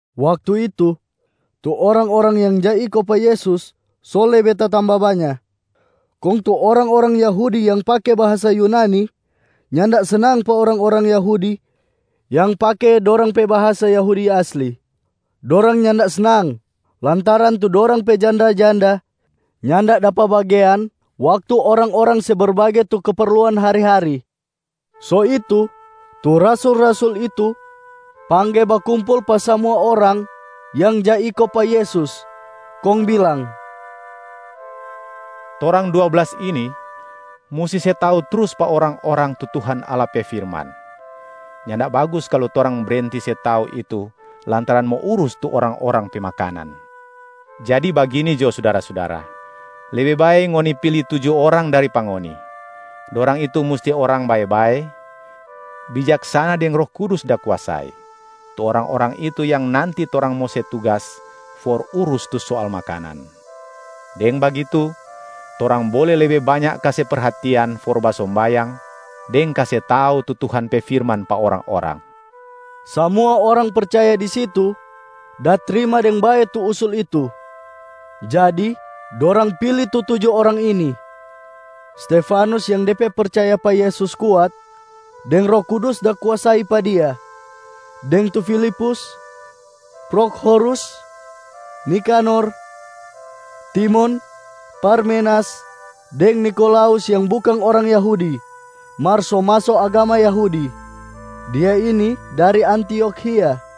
Waktu itu, tu orang-orang yang ja iko pa Yesus so lebe tatamba banya, kong tu orang-orang Yahudi yang pake bahasa Yunani nyanda snang pa orang-orang Yahudi yang pake dorang pe bahasa Yahudi aslia. Dorang nyanda snang lantaran tu dorang pe janda-janda nyanda dapa bagean waktu orang-orang se berbage tu keperluan hari-hari. So itu, tu rasul-rasul itu pangge bakumpul pa samua orang yang ja iko pa Yesus kong bilang, “Torang dua blas ini musti se tau trus pa orang-orang tu Tuhan Allah pe firman. Nyanda bagus kalu torang brenti se tau itu lantaran mo urus tu orang-orang pe makanan. Jadi bagini jo sudara-sudara, lebe bae ngoni pili tuju orang dari pa ngoni. Dorang itu musti orang bae-bae, bijaksana deng Roh Kudus da kuasai. Tu orang-orang itu yang nanti torang mo se tugas for urus tu soal makanan. Deng bagitu, torang bole lebe banya kase perhatian for basombayang deng kase tau tu Tuhan pe firman pa orang-orang.” Samua orang percaya di situ da trima deng bae tu usul itu. Jadi dorang pili tu tuju orang ini: Stefanus yang de pe percaya pa Yesus kuat deng Roh Kudus da kuasai pa dia, deng tu Filipus, Prokhorus, Nikanor, Timon, Parmenas, deng Nikolaus yang bukang orang Yahudi mar so maso agama Yahudi, dia ini dari Antiokhia.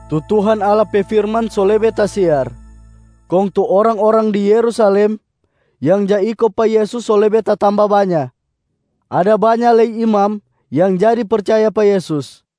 Tu Tuhan Allah pe firman so lebe tasiar, kong tu orang-orang di Yerusalem yang ja iko pa Yesus so lebe tatamba banya. Ada banya lei imam yang jadi percaya pa Yesus.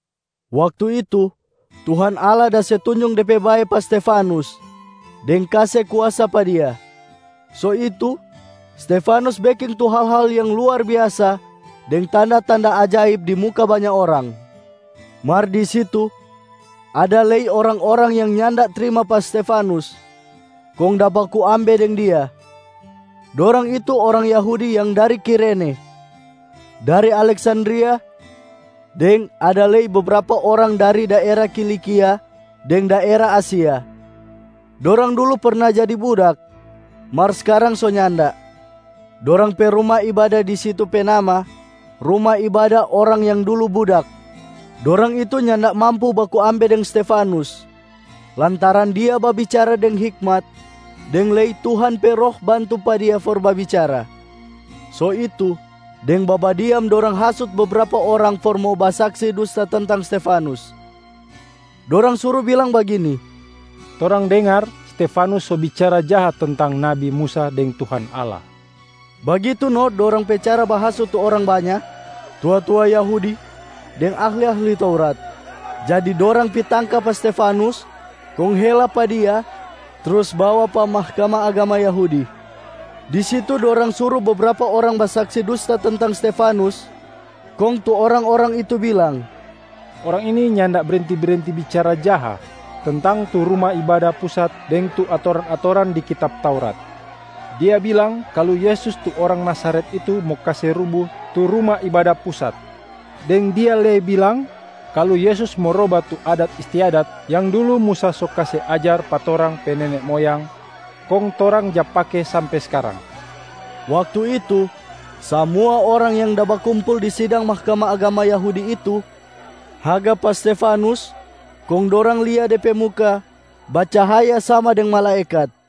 Waktu itu Tuhan Allah da se tunjung De pe bae pa Stefanus deng kase kuasa pa dia, so itu Stefanus beking tu hal-hal yang luar biasa deng tanda-tanda ajaib di muka banya orang. Mar di situ ada lei orang-orang yang nyanda trima pa Stefanus kong da baku ambe deng dia. Dorang itu orang Yahudi yang dari Kirene, dari Aleksandria, deng ada lei bebrapa orang dari daera Kilikia deng daera Asia. Dorang dulu perna jadi budak, mar skarang so nyanda. Dorang pe ruma ibada di situ pe nama, ‘Ruma Ibada orang yang dulu budak’. Dorang itu nyanda mampu baku ambe deng Stefanus lantaran dia babicara deng hikmat deng lei Tuhan pe Roh bantu pa dia for babicara. So itu, deng babadiam dorang hasut bebrapa orang for mo basaksi dusta tentang Stefanus. Dorang suru bilang bagini, “Torang dengar Stefanus so bicara jaha tentang nabi Musa deng Tuhan Allah.” Bagitu no dorang pe cara bahasut tu orang banya, tua-tua Yahudi deng ahli-ahli Taurat. Jadi dorang pi tangka pa Stefanus, kong hela pa dia trus bawa pa Mahkamah Agama Yahudi. Di situ dorang suru bebrapa orang basaksi dusta tentang Stefanus, kong tu orang-orang itu bilang, “Orang ini nyanda brenti-brenti bicara jaha tentang tu Ruma Ibada Pusat deng tu atoran-atoran di kitab Taurat. Dia bilang kalu Yesus tu orang Nazaret itu mo kase rubu tu Ruma Ibada Pusat, deng dia lei bilang kalu Yesus mo roba tu adat istiadat yang dulu Musa so kase ajar pa torang pe nene moyang, kong torang ja pake sampe skarang.” Waktu itu, samua orang yang da bakumpul di sidang Mahkamah Agama Yahudi itu haga pa Stefanus kong dorang lia de pe muka bacahaya sama deng malaekat.